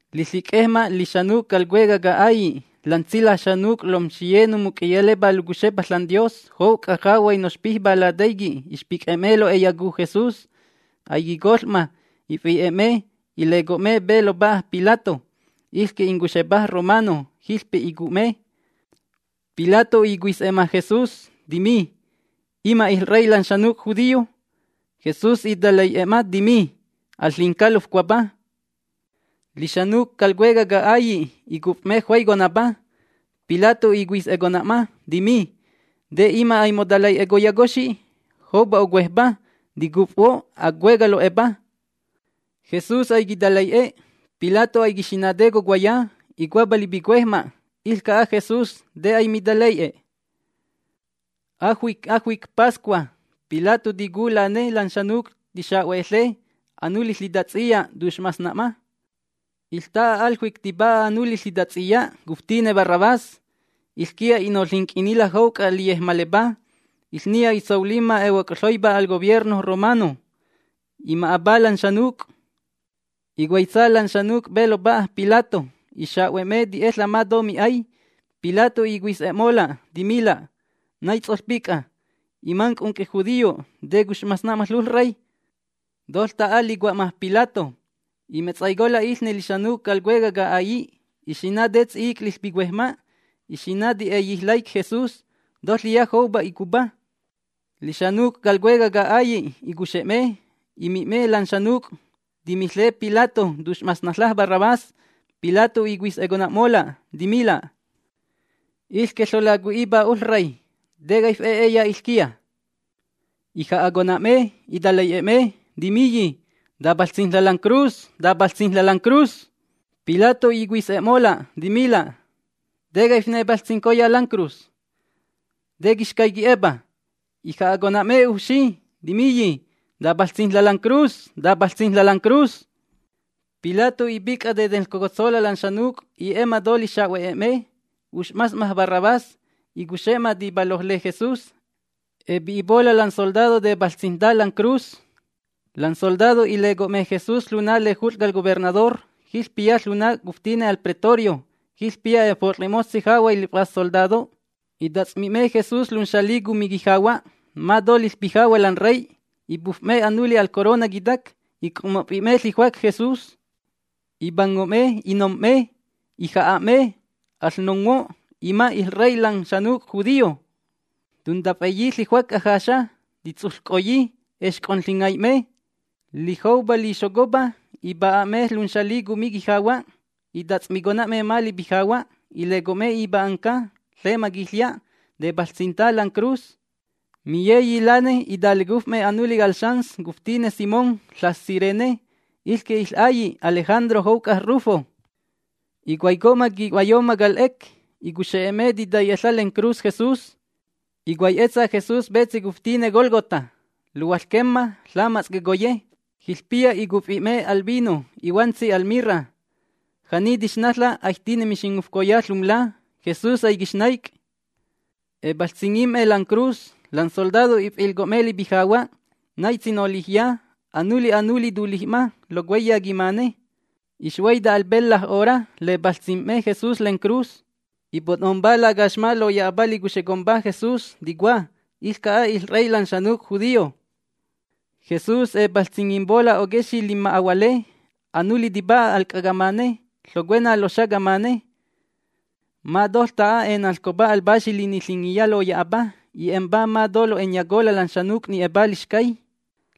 Liƚic'ejma lixanuc' cal cuecaj ca'ailli', lan tsilaj xanuc', lomxiye nomuc'iyalepá locuxepa ȽanDios jouc'a jahuay noxpijpá lataiqui' ixpic'e'me lo'e'eyacu Jesús. Aiquicoƚ'ma, ifi'e'me, ileco'me pe lopa'a Pilato, iƚque incuxepa romano. Jiƚpe icu'me. Pilato icuis'e'ma Jesús, timi: ―¿Ima' iƚrey lan xanuc' judío? Jesús italai'e'e'ma, timi: ―Al ƚinca lofcuapa. Lixanuc' cal cuecaj ca'ailli' icuf'me juaiconapa. Pilato icuis'econa'ma, timi: ―¿Te ima' aimotalai'ecoyacoxi? Joupa ocuejpa. Ticufhuo' acueca' lo'epa. Jesus aiquitalai'e. Pilato aiquixina' te cocuaya. Icuapa lipicuejma': “Iƚca'a Jesús, ¿te aimitalai'e?” Ajuic ajuic Pascua, Pilato ticu lane lan xanuc' tixahue'eƚe anuli ƚitats'iya, tux'mas'ma. Iƚta'a al juic tipa'a anuli ƚitats'iya cuftine Barrabás. Iƚquiya i'noƚinc'innila' jouc'a liyejmalepá. Iƚniya itsolimma ehuoc'huaipá cal gobierno romano. Ima'apá lan xanuc'. Icuaitsa lan xanuc' pe lopa'a Pilato. Ixa'hue'me ti'eƚa' ma to mi'ay. Pilato icuis'e'mola', timila': ―¿Nai ts'oƚpic'a? Imanc' unc'ijudío, ¿te cux'mas'ma ƚoƚrey? Toƚta'a licua'ma Pilato, imetsaicola' iƚne lixanuc' cal cuecaj ca'ailli'. Ixina' te ts'i'ic' liƚpicuejma'. Ixina' ti'eyi laic' Jesús, toƚiya joupa icupá. Lixanuc' cal cuecaj ca'ailli' icuxe'me, imi'me lan xanuc' timiƚe Pilato tux'masnaƚa' Barrabás. Pilato icuis'econa'mola', timila': ―Iƚque ƚolacui'ipa oƚrey, ¿te caif'e'eya iƚquiya? Ija'acona'me, italai'e'me, timiyi: ―¡Tapaƚts'ijnla' lancruz! Pilato icuis'e'mola', timila': ―¿Te caifnepaƚts'ijncoya lancruz? ¿Te quixcay qui'epa? Ija'a'me ujfxi, timiyi: ―¡Tapaƚts'ijnla' lancruz! Pilato ipic'a tetenƚcocotsola' lan xanuc'. I'e'ma to lixa'hue'me. Ux'masna'ma Barrabás, icuxe'ma tipalojle Jesús. Epi'ipola' lan soldado tepaƚts'ijnta lancruz. Lan soldado ileco'me Jesús ƚuna lejut'ƚ cal gobernador. Jiƚpiya ƚuna cuftine al Pretorio. Jiƚpiya efot'ƚe'moƚtsi jahuay liƚf'as soldado. Itats'mi'me Jesús lunxali cumi quijahua', ma to liƚpijahua' lan rey. Ipuf'me anuli al corona quitac, ic'ommof'i'i'me ƚijuac Jesús. Ipango'me inom'me, ija'a'me: ―¡Aƚnonghuo', ima' iƚrey lan xanuc' judío! Tuntaf'e'eyi ƚijuac ajaxa, titsuƚc'oyi. Exc'onƚingai'me. Lijoupa lixocopa, ipa'e'e'me lunxali cumi quijahua', itats'micona'me ma lipijahua'. Ileco'me ipa'anca lema quiƚya', tepaƚts'ijnta lancruz. Miyeyi lane italecuf'me anuli cal xans cuftine Simón, ƚas Cirene. Iƚque iƚ'ailli' Alejandro jouc'a Rufo. Icuaico'ma qui'huayonamma cal 'ec. Icuxe'e'me titaiƚa' lencruz Jesús. Icuai'etsa Jesús petsi cuftine Gólgota, luhuaƚquemma: Ƚamats' Quecoye. Jiƚpiya icufi'me al vino ihuantsi al mirra. Ja'ni tixnaƚa' aijtine mixingufcoya ƚumla. Jesús aiquixnaic'. Epaƚts'ingim'me lancruz. Lan soldado if'ilco'me lipijahua', naitsi nolijya. Anuli anuli tulij'ma locuaiya quimane. Ixhuaita al pelƚa 'hora lepaƚts'ijm'me Jesús lencruz. Ipo'nompá lacaxma loya'apa licuxecompa Jesús, ticua: “Iƚca'a iƚrey lan xanuc' judío”. Jesús epaƚts'ingimpola' oquexi' linma'ahuale. Anuli tipa'a al c'a camane, ƚocuena loxa camane. Ma toƚta'a enanƚcopa al Paxi Liniƚingiya loya'apa: “I'e'empá ma to lo'e'enyacola' lan xanuc' ni'epá lixcay”.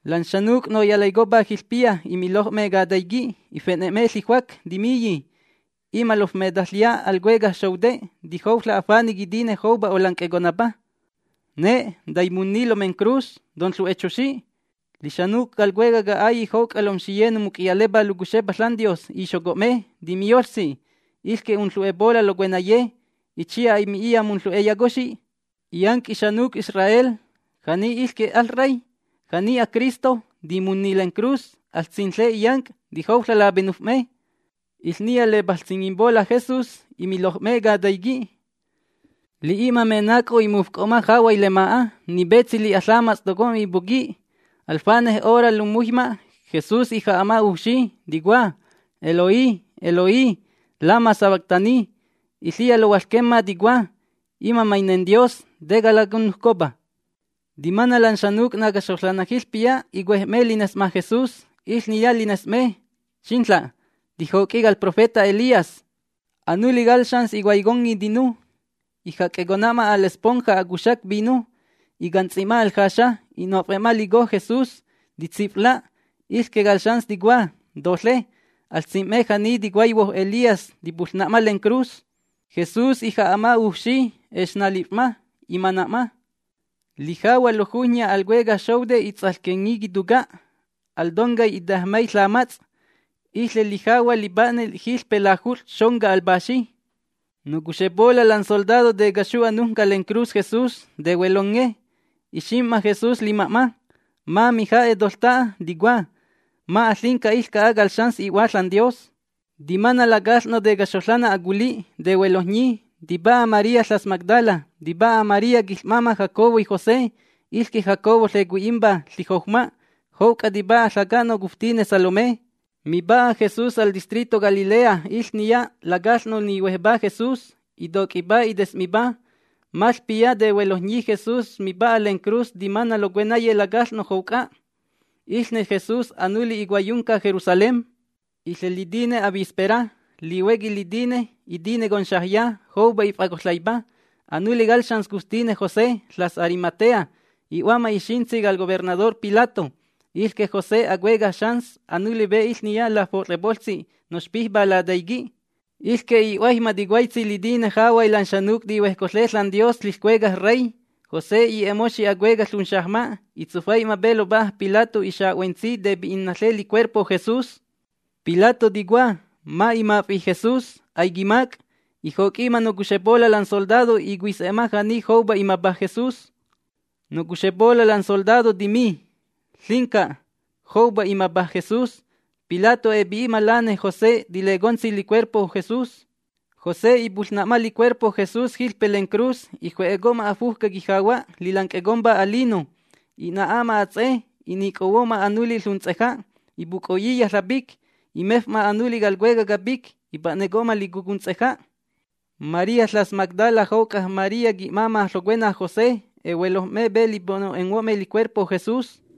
Lan xanuc' noyalaicopá jiƚpiya imiloj'me cataiqui', ife'ne'me ƚiƚjuac, timiyi: ―Ima' lofmeteƚya al cuecaj xoute', tijouƚa' afane' quitine joupa olanc'econapa, ne', taimunni lomencruz. ¡Tonƚu'exoxi! Lixanuc' cal cuecaj ca'ailli', jouc'a lomxiye nomuc'iyalepá locuxepa ȽanDios ixoco'me, timiyoƚtsi: ―Iƚque unƚu'epola' locuenaye. Itsiya aimi'iya munƚu'eyacoxi. Illanc' ixanuc' Israel, ja'ni iƚque aƚrey, ja'ni aCristo, ¡timunni lencruz! Aƚsinƚe illanc', tijouƚa' lapenuf'me. Iƚniya lepaƚts'ingimpola' Jesús imiloj'me cataiqui'. Li'i'ma menac'o imufc'o'ma jahuay lema'a. Ni petsi li'a ƚamats' tocomma ipuqui'. Al fanej hora lummuhuijma' Jesús ija'a'ma ujfxi, ticua: ―Eloí, Eloí, ¿lama sabactani? Iƚiya lohuaƚquemma ticua: “Ima' mainenDios, ¿te calacanujcopa?” Timana' lan xanuc' nacaxoƚanna jiƚpiya icuej'me lines'ma Jesús, iƚniya lines'me: ―¡Xinƚa'! Tijoc'i cal profeta Elías. Anuli cal xans icuaiconni tinu, ijac'eco'ma al esponja acuxac vino. Icants'i'ma al jaxa, i'nof'e'ma lico Jesús, titsif'la'. Iƚque cal xans ticua: ―¡Toƚe! Aƚsim'me ja'ni ticuaihuo Elías, tipuƚna'ma lencruz. Jesús ija'a'ma ujfxi. Exnalif'ma, imana'ma. Lijahua' lojujnya al cuecaj xoute' its'aƚquenni quituca', al toncay itejmay ƚamats'. Iƚe lijahua' lipa'ne jiƚpe Lajut'ƚ Xonca al Paxi. Nocuxepola' lan soldado tecaxu anujnca lencruz Jesús, tehuelonge. Ixim'ma Jesús lima'ma ma mija'e' toƚta'a. Ticua: ―Ma' aƚinca iƚca'a cal xans i'Hua ȽanDios. Timana' lacaƚ'no' tecaxoƚanna aculi', tehuelojnyi. Tipa'a María ƚas Magdala, tipa'a María quiƚ'máma' Jacobo y José. Iƚque Jacobo ƚecui'impa: Ƚijoujma. Jouc'a tipa'a ƚaca'no' cuftine Salomé. Mipa'a Jesús al distrito Galilea iƚniya lacaƚ'no' ihuejpá Jesús, itoc'ipá, ites'mipá. Maƚpiya tehuelojnyi Jesús mipa'a lencruz timana' locuenaye lacaƚ'no' jouc'a. Iƚne y Jesús anuli icuaiyunca Jerusalén. Iƚe litine avispera. Lihuequi litine itine conxajya. Joupa if'acoƚaipa. Anuli cal xans cuftine José, ƚas Arimatea, i'hua'ma ixintsi cal gobernador Pilato. Iƚque José acuecaj xans, anuli pe iƚniya nafot'ƚepoƚtsi noxpijpá lataiqui'. Iƚque i'huaijma ticuaitsi litine jahuay lan xanuc' tihuejcoƚe ȽanDios ƚiƚCuecaj Rey. José i'e'e'moxi acueca' ƚunxajma'. Itsufai'ma pe lopa'a Pilato, ixahue'etsi tepi'inaƚe licuerpo Jesús. Pilato ticua: “Ma' imaf'i' Jesús, aiquimac'”. Ijoc'i'ma nocuxepola' lan soldado. Icuis'e'ma ja'ni joupa imapa Jesús. Nocuxepola' lan soldado timi: “Ƚinca, joupa imapa Jesús”. Pilato epi'i'ma lane José tilecotsi licuerpo Jesús. José ipuƚna'ma licuerpo Jesús jiƚpe lencruz. Iju'eco'ma afujca quijahua' lilanc'ecompa alino, i'na'apa ats'e. I'nicohuo'ma anuli ƚunts'eja', ipuc'o'iya ƚapic. Imef'ma anuli cal cueca' capic, ipa'neco'ma lico ƚunts'eja'. María ƚas Magdala, jouc'a María qui'máma' ƚocuenaj José, ehuelojm'me pe lipo'no'enghuo'me licuerpo Jesús.